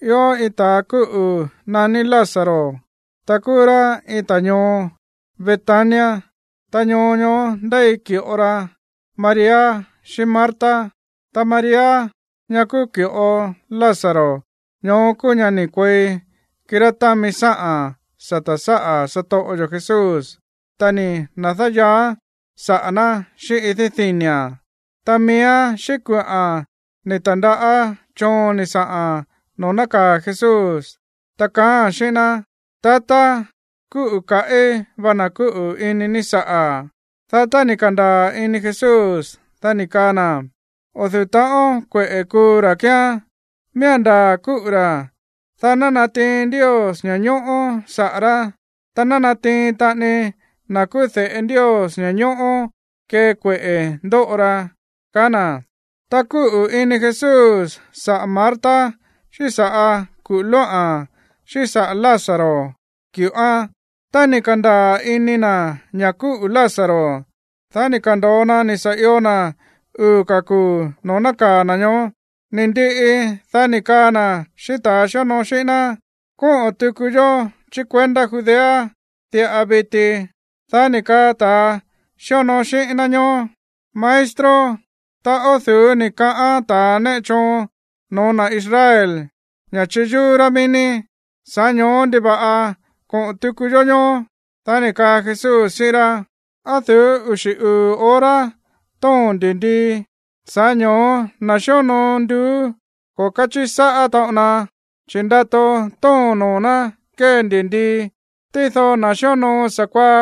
Ió iin ta̱a kúꞌu̱ naní Lázaro, ta kúú rá iin ta̱ ñoo Betania, ta ñoo ñoó ndéi ki̱ꞌo ra María xíꞌín Marta. Ta María, ñá kúú ki̱ꞌo Lázaro ñoó kúú ñá ni̱ kuei kirá támi sáꞌa̱n sata̱ sáꞌa̱ satoꞌo yo̱ Jesús, ta ni̱ na̱dáyaaán saꞌa̱ ná xíꞌín idí dini̱a̱n. Ta miíán xíꞌín kuꞌa̱n ni̱ ta̱ndaꞌá choon ni̱ saꞌa̱n noo̱ nákaa̱ Jesús, ta kaáa̱n xíꞌín ná: “Tatá, kúꞌu̱ kaꞌí va na̱ kúꞌu̱ ini ní saꞌa̱.” Dá tá ni̱ ka̱ndaa̱ ini Jesús, dá ni̱ kaa na̱: ―O̱ du̱ú taꞌon kueꞌe̱ kuu ra̱ kíán, miía̱n ndaa̱ kúꞌu̱ ra̱, dá ná natiin Ndios ña̱ñóꞌó saꞌa̱ rá, ta ná natiin taꞌani na̱ kúú de̱ꞌe Ndios ña̱ñóꞌó kee kueꞌe̱ ndóꞌo ra ―kaá na̱. Ta kúꞌu̱ ini Jesús saꞌa̱ Marta, xíꞌín saꞌa̱ kuꞌu̱ lóꞌa̱n, xíꞌín saꞌa̱ Lázaro, ki̱ꞌoán. Tá ni̱ ka̱ndaa̱ ini na̱ ña̱ kúꞌu̱ Lázaro, dá ni̱ ka̱ndo̱o na ni̱ sa̱ io na̱ uu̱ ka̱ kuu̱ noo̱ nákaa̱ na̱ ñoó. Ni̱ ndiꞌi, dá ni̱ kaa na̱ xíꞌín ta̱a xíonoo xíꞌín ná: ―Kóꞌo̱ tuku yó chí kuendá Judea diꞌa viti. Dá ni̱ kaa ta̱ xíonoo xíꞌín ná ñoó: ―Maestro, ta o̱ du̱ú ni̱ kaꞌán ta̱ néꞌe choon no̱ó na̱ Israel ña̱ chiyúú rá mií ní. Sa̱ꞌá ño̱ó ¿ndiva̱ꞌa koꞌo̱n tuku yó ñoó? Dá ni̱ kaa Jesús xíꞌín rá: ―¿Á du̱ú uxi̱ uu̱ hora tóo̱n ndi̱ndii? Sa̱ꞌá ño̱ó na̱ xíonoo nduú, ko̱ káchiꞌi sáꞌá taꞌon na, chi̱ ndato tóo̱n noo̱ ná kée ndi̱ndii. Tído na̱ xíonoo sa̱kuaá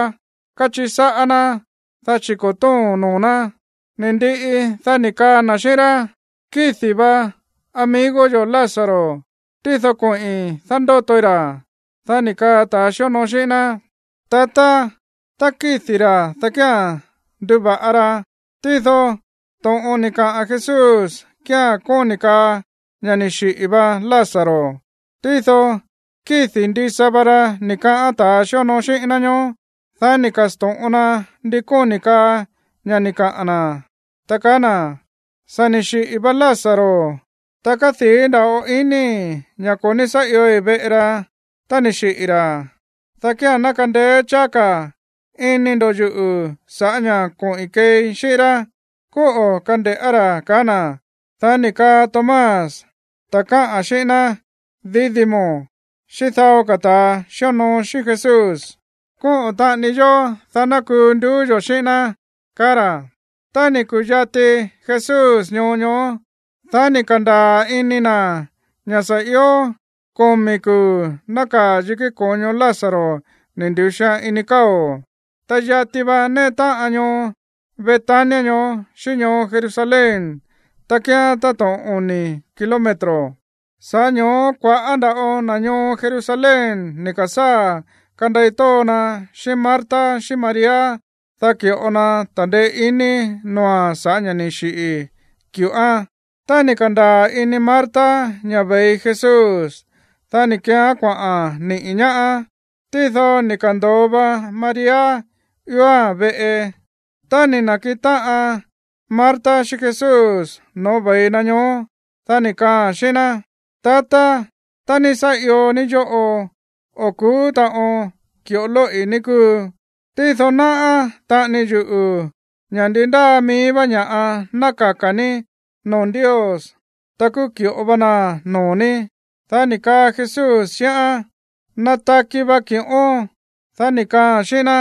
káchiꞌi sáꞌá ná, dá chi̱ ko̱ tóo̱n noo̱ ná. Ni̱ ndiꞌi, dá ni̱ kaa na̱ xíꞌín rá: ―Kídi̱ va amigo yo̱ Lázaro, tído koꞌi̱n dándótoi ra̱. Dá ni̱ kaa ta̱a xíonoo xíꞌín ná: ―Tatá, tá kídi̱ ra̱, dá kía̱n nduva̱ꞌa ra. Tído to̱ꞌon ni̱ kaꞌa̱n Jesús kía̱n kóni̱ kaa ña̱ ni̱ xiꞌi̱ va Lázaro, tído kídi̱ ndisa va ra ni̱ kaꞌán ta̱a xíonoo xíꞌín ná ñoó. Dá ni̱ ka̱sto̱ꞌon na ndi kóni̱ kaa ña̱ ni̱ kaꞌa̱n na̱, ta kaá na̱: ―Sa̱ ni̱ xiꞌi̱ va Lázaro, ta kádii̱ nda̱ꞌo inii̱ ña̱ ko̱ ní sá iói̱ veꞌe ra tá ni̱ xiꞌi̱ ra̱, dá kía̱n ná kandeé cháá ka̱ ini ndo̱ yuꞌu̱ sa̱ꞌá ña̱ koꞌi̱n keei xíꞌín rá. Kóꞌo̱ kande̱ꞌá ra̱ ―kaá na̱. Dá ni̱ kaa Tomás, ta̱ káꞌa̱n xíꞌín ná Dídimo, xíꞌín dao ka̱ ta̱ xíonoo xíꞌín Jesús: ―Kóꞌo̱ taꞌani yó, dá ná kuu nduú yo̱ xíꞌín ná ―kaá ra̱. Tá ni̱ ku̱yati Jesús ñoo ñoó, dá ni̱ ka̱ndaa̱ ini na̱ ña̱ sa̱ io komi̱ kuu̱ nákaa̱ yikí ko̱ño Lázaro ni̱ ndu̱xian ini káo̱. Ta yati va néꞌe táꞌan ñoo Betania ñoó xíꞌín ñoo Jerusalén, ta kíán táto̱ꞌon oni̱ kilómetro. Sa̱ꞌá ño̱ó kua̱ꞌá nda̱ꞌo na̱ ñoo Jerusalén ni̱ ka̱sáa̱ kandei tóo na xíꞌín Marta xíꞌín María, dá ki̱ꞌo na ta̱ndeé iní noo̱a̱n sa̱ꞌá ña̱ ni̱ xiꞌi̱ ki̱ꞌoán. Tá ni̱ ka̱ndaa̱ ini Marta ña̱ ve̱i Jesús, dá ni̱ keeán kuaꞌa̱n niꞌi̱ ñaáán, tído ni̱ ka̱ndo̱o va María ióa̱n veꞌe. Tá ni̱ na̱kiꞌin táꞌan Marta xíꞌín Jesús no̱ó ve̱i na ñoó, dá ni̱ kaaa̱n xíꞌín ná: ―Tatá, tá ní sá io ní yóꞌo, o̱ ku̱ú taꞌon ki̱ꞌo lóꞌi̱, ní kúu. Tído náꞌá taꞌani yuꞌu̱ ña̱ ndi ndáa mií vá ña̱ꞌa ná kaka̱ ní noo̱ Ndios, ta kúú ki̱ꞌo va naa̱n noo̱ ní. Dá ni̱ kaa Jesús xíꞌán: ―Nataki va ki̱ꞌón. Dá ni̱ kaaa̱n xíꞌín ná: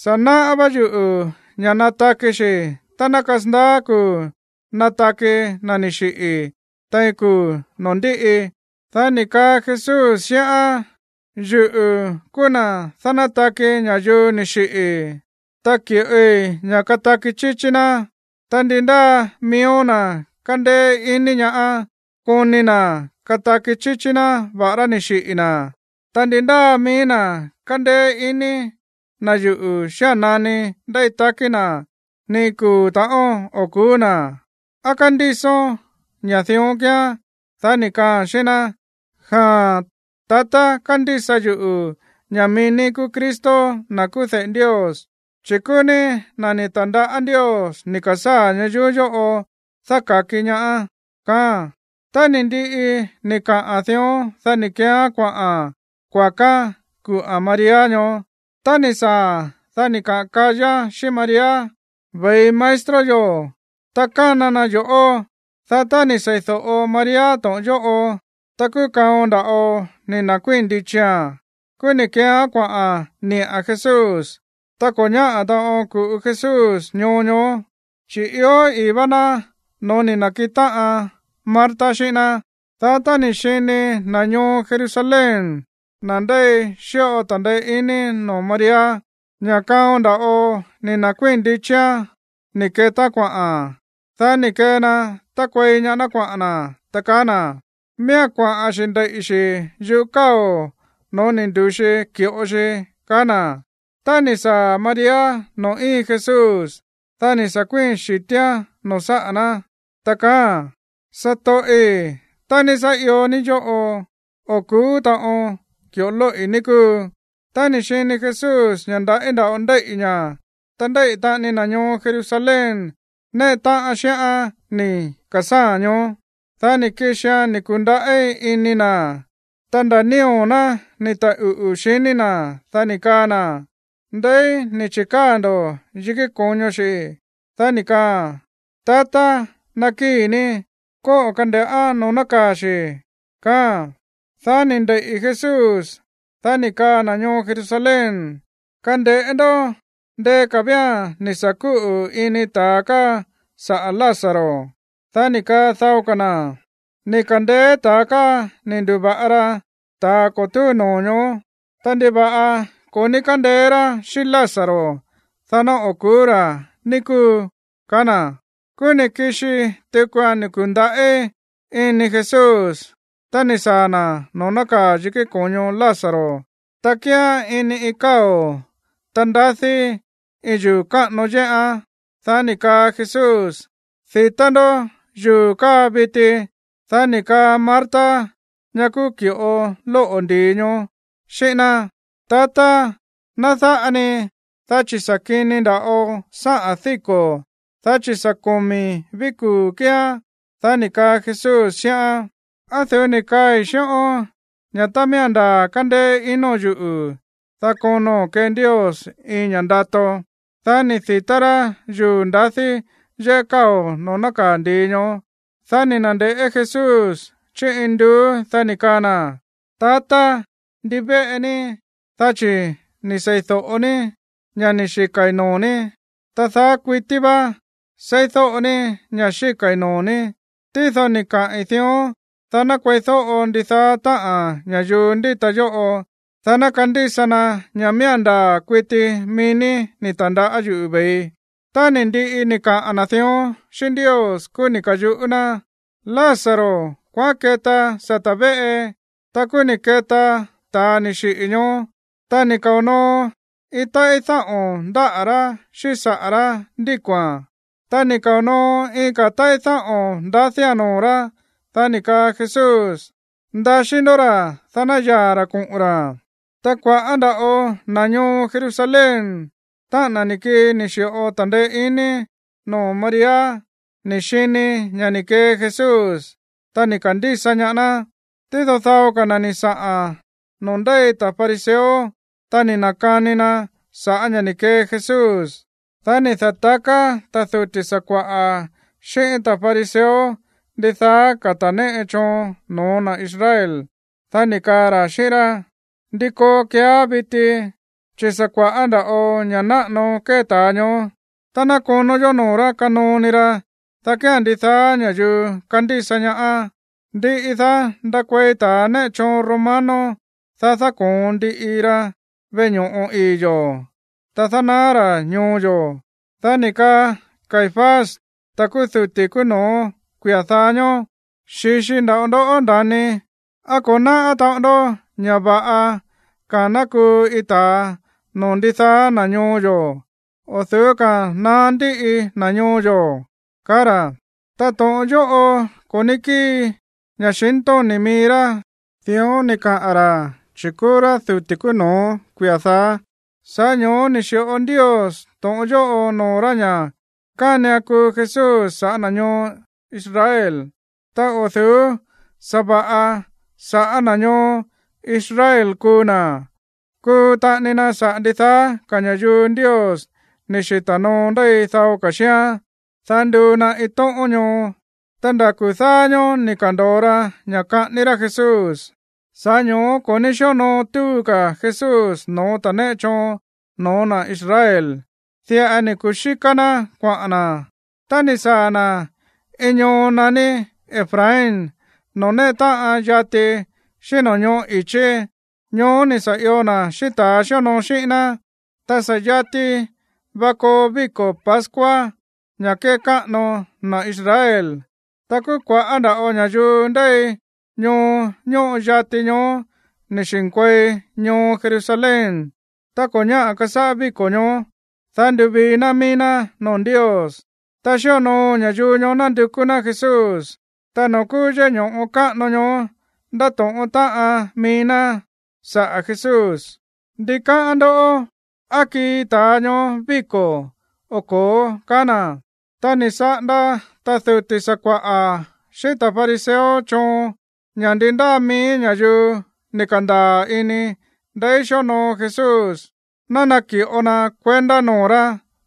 ―Sa̱ náꞌá vá yuꞌu̱ ña̱ nataki xi̱ tá ná kasandaá kuu̱ nataki na̱ ni̱ xiꞌi̱ tein kuu̱ noo̱ ndíꞌi. Dá ni̱ kaa Jesús xíꞌán: ―Yuꞌu̱ kúú na̱ dánátaki ña̱yuu ni̱ xiꞌi̱, ta ki̱ꞌoi ña̱ kataki chíchí ná. Ta ndi ndáa miíó na̱ kándéé iní ñaá, koni na̱ kataki chíchí ná, va̱ꞌará ni̱ xiꞌi̱ na̱. Ta ndi ndáa mií na̱ kándéé iní na̱ yuꞌu̱ xía̱n nani ndéi takí na̱, ni iin kuu̱ ta̱ꞌón o̱ ku̱ú na̱. ¿Á kándísón ña̱ dión kíán? Dá ni̱ kaaa̱n xíꞌín ná: ―Jaa̱n, tatá. Kándísa yuꞌu̱ ña̱ mií ní kúú Cristo, na̱ kúú de̱ꞌe Ndios, chi̱ kúú ní na̱ ni̱ ta̱ndaꞌá Ndios ni̱ ka̱sáa̱ ñayuú yóꞌo dáka̱ki ñaá ―kaáa̱n. Tá ni̱ ndiꞌi ni̱ kaꞌa̱n dión, dá ni̱ keeán kuaꞌa̱n kuakaán kuꞌa̱n María ñoó. Tá ni̱ saa̱a̱n, dá ni̱ kaꞌa̱n kayáa̱n xíꞌín María: ―Ve̱i maestro yo̱, ta kána na yo̱ꞌó. Dá tá ni̱ seídóꞌo María to̱ꞌon yóꞌo, ta kúú kaon nda̱ꞌo ni̱ na̱kuíi̱n ndichia̱n, kúú ni̱ keeán kuaꞌa̱n niꞌa̱n Jesús. Ta ko̱ ñáꞌa̱ taꞌon ku̱ꞌu Jesús ñoo ñoó, chi̱ ió i̱í vá ná noo̱ ni̱ na̱kiꞌin táꞌan Marta xíꞌín ná. Dá tá ni̱ xini na̱ ñoo Jerusalén, na̱ ndéi xíꞌo ta̱ndeé iní noo̱ María, ña̱ kaon nda̱ꞌo ni̱ nda̱kuíi̱n ndichia̱n ni̱ ketaán kuaꞌa̱n, dá ni̱ kee na tákuei ñaá ná kuaꞌa̱n na̱, ta kaá na̱: ―Miía̱n kuaꞌa̱n xi̱ ndeiꞌi̱ xi̱ yúꞌu̱ káo̱ no̱ó ni̱ ndu̱xi ki̱ꞌo xi ―kaá na̱. Tá ni̱ saa̱ María noo̱ íin Jesús, dá ni̱ sa̱ kuíi̱n xi̱tíán noo̱ sáꞌa̱ ná, ta kaáa̱n: ―Satoꞌi̱, tá ní sá io ní yóꞌo, o̱ ku̱ú taꞌon ki̱ꞌo lóꞌi̱, ní kúu. Tá ni̱ xini Jesús ña̱ ndaꞌí nda̱ꞌo ndéíꞌi̱ ña̱, ta ndéíꞌi̱ taꞌani na̱ ñoo Jerusalén néꞌe táꞌan xíꞌán ni̱ ka̱sáa̱a̱n, ñoó, dá ni̱ kixia̱n ni̱ ku̱ndaꞌí ini na̱, ta nda̱ nío̱ ná ni̱ taꞌuꞌu̱, xiní na̱. Dá ni̱ kaa na̱: ―¿Ndeí ni̱ chi̱káa̱ ndo̱ yikí ko̱ño xi̱? Dá ni̱ kaaa̱n: ―Tatá, nakíi̱ ní, kóꞌo̱ kande̱ꞌá noo̱ nákaa̱ xi̱ ―kaáa̱n. Dá ni̱ ndeiꞌi̱ Jesús. Dá ni̱ kaa na̱ ñoo Jerusalén: ―Kande̱ꞌé ndó. Ndeé ka̱ vía̱n ni̱ sa̱ kúꞌu̱ ini ta̱a káa saꞌa̱ Lázaro. Dá ni̱ kaa dao ka̱ na̱: ―Ni̱ ka̱ndeé ta̱a káa ni̱ ndu̱va̱ꞌa ra ta̱a ko̱ túu noo̱ ñoó. Ta, ¿ndiva̱ꞌa ko̱ ní kándeé rá xíꞌín Lázaro, dá ná o̱ ku̱ú ra̱, ní kúu? ―kaá na̱. Kúú ni̱ kixi tukua̱n ni̱ ku̱ndaꞌí ini Jesús tá ni̱ saa̱ na̱ noo̱ nákaa̱ yikí ko̱ño Lázaro. Ta kíán ini iin káo̱, ta ndadí iin yuu̱ káꞌano yéꞌán. Dá ni̱ kaa Jesús: ―Di̱tá ndó yuu̱ káa viti. Dá ni̱ kaa Marta, ñá kúú ki̱ꞌo lóꞌo̱ ndi̱i ñoó, xíꞌín ná: ―Tatá, ná dáꞌa ni, dá chi̱ sa̱ kini nda̱ꞌo sáꞌa̱n díko̱, dá chi̱ sa̱ komi̱ ví kuu̱ kíán. Dá ni̱ kaa Jesús xíꞌán: ―¿Á du̱ú ni̱ kaꞌi̱n xíꞌón ña̱ tá miía̱n ndaa̱ kándéé inóo̱n yuꞌu̱, dá kono̱n kee Ndios iin ña̱ ndato? Dá ni̱ di̱tá rá yuu̱ ndadí yéꞌé káo̱ noo̱ nákaa̱ ndi̱i ñoó. Dá ni̱ na̱nde̱ꞌé Jesús chí induú, dá ni̱ kaa na̱: ―Tatá, ndivéꞌe ní, dá chi̱ ni̱ seídóꞌo ní ña̱ ni̱ xika̱i̱ noo̱ ní. Ta daá kuití vá seídóꞌo ní ña̱ xíka̱i̱ noo̱ ní, tído ni̱ kaꞌi̱n dión, dá ná kueídóꞌo ndidaá táꞌa̱n ña̱yuu ndíta yóꞌo, dá ná kandísa na ña̱ miía̱n ndaa̱ kuiti mií ní ni̱ ta̱ndaꞌá yuꞌu̱ ve̱ii. Tá ni̱ ndiꞌi ni̱ kaꞌa̱n na̱ dión xíꞌín Ndios, kúú ni̱ ka̱yuꞌú ná: ―Lázaro, kuaꞌán keta sata̱ véꞌe. Ta kúú ni̱ keta ta̱a ni̱ xiꞌi̱ ñoó, ta ni̱ kao̱ noo iin táꞌí dáꞌo̱n ndáꞌa̱ rá xíꞌín saꞌa̱ rá ndíko̱a̱n. Ta ni̱ kao̱ noo iin ka̱ táꞌí dáꞌo̱n ndadía̱n noo̱ rá. Dá ni̱ kaa Jesús: ―Ndaxí ndó ra̱, dá ná yaa̱ ra̱ koꞌo̱n ra̱. Ta kua̱ꞌá nda̱ꞌo na̱ ñoo Jerusalén, táꞌa̱n na̱ ni̱ kii ni̱ xi̱ꞌo ta̱ndeé iní noo̱ María, ni̱ xini ña̱ ni̱ kee Jesús, ta ni̱ ka̱ndísa ñaá ná. Tído dao ka̱ na̱ ni̱ saꞌa̱n noo̱ ndéi ta̱ fariseo, ta ni̱ na̱kani na sa̱ꞌá ña̱ ni̱ kee Jesús. Dá ni̱ da̱taká ta̱ duti̱ sakua̱ꞌa̱ xíꞌín ta̱ fariseo ndidaá ka̱ ta̱ néꞌe choon no̱ó na̱ Israel. Dá ni̱ kaa ra̱ xíꞌín rá: ―¿Ndi koo keeá viti? Chi̱ sa̱ kua̱ꞌá nda̱ꞌo ña̱ náꞌano kée ta̱a ñoó. Tá ná konó yó noo̱ rá kanoo ni ra, dá kía̱n ndidaá ña̱yuu kandísa ñaá. Ndiꞌi, dá ndakuei ta̱ néꞌe choon romano, ta dáko̱on ndiꞌi ra veꞌe ño̱ꞌo ii̱ yo̱, ta dánaá ra̱ ñoo yo̱. Dá ni̱ kaa Caifás, ta̱ kúú duti̱ kúú no̱ó kuia̱ dáá ñóó: ―Xi̱xi nda̱ꞌo ndó, nda̱ni. ¿Á ko̱ náꞌá taꞌon ndó ña̱ va̱ꞌa ka̱a̱n ná kuu iin ta̱a noo̱ ndidaá na̱ ñoo yo̱ o̱ du̱ú ka̱a̱n naá ndíꞌi na̱ ñoo yo̱? ―kaá ra̱. Ta to̱ꞌon yóꞌo ko̱ ní kíi ña̱xintóni̱ mií rá. Dión ni̱ kaꞌa̱n ra̱, chi̱ sa̱ꞌá ña̱ kúú rá duti̱ kúú no̱ó kuia̱ dáá, sa̱ꞌá ño̱ó ni̱ xi̱ꞌo Ndios to̱ꞌon yóꞌo noo̱ rá ña̱ kánian kuu Jesús sa̱ꞌá na̱ ñoo Israel. Ta o̱ du̱ú sa̱va̱ꞌa sa̱ꞌá na̱ ñoo Israel kuu na̱, kuu taꞌani na saꞌa̱ ndidaá ka̱ ña̱yuu Ndios ni̱ xita̱ noo ndéi dao ka̱ xíán, dá nduu na iin tóꞌón ñoo. Ta nda̱ kuu̱ dáá ñóó ni̱ ka̱ndo̱o ra ña̱ kaꞌání rá Jesús. Sa̱ꞌá ño̱ó ko̱ ní xíonoo túu ka̱ Jesús no̱ó ta̱ néꞌe choon no̱ó na̱ Israel. Diꞌa ni̱ kuxíká ná kuaꞌa̱n na̱, ta ni̱ saa̱ na̱ iin ñoo naní Efraín noo̱ néꞌe táꞌan yati xíꞌín no̱ñóꞌo̱ i̱chí. Ñoó ni̱ sa̱ io na̱ xíꞌín ta̱ xíonoo xíꞌín ná. Ta sa̱ yati va koo víko̱ pascua ña̱ kékáꞌano na̱ Israel. Ta kúú kua̱ꞌá nda̱ꞌo ña̱yuu ndéi ñoo ñóꞌo yati ñoó ni̱ xi̱nkuei ñoo Jerusalén tá ko̱ ñáꞌa̱ kasáꞌá víko̱ ñoó, dá nduvii ná mií ná noo̱ Ndios. Ta xíonoo ña̱yuu ñoó nándukú ná Jesús. Ta noo̱ kúú yéꞌé ño̱ꞌo káꞌano ñoó ndáto̱ꞌón táꞌan mií ná saꞌa̱ Jesús: ―¿Ndi káꞌán ndó? ¿Á kii ta̱a ñoó víko̱ o ko̱ó? ―kaá na̱. Ta ni̱ saꞌanda ta̱ duti̱ sakua̱ꞌa̱ xíꞌín ta̱ fariseo choon ña̱ ndi ndáa mií ña̱yuu ni̱ ka̱ndaa̱ ini ndeí xíonoo Jesús, ná naki̱ꞌo na kuendá noo̱ rá,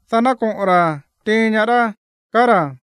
dá ná koꞌo̱n ra̱ tiin ñaá rá, kaá ra̱.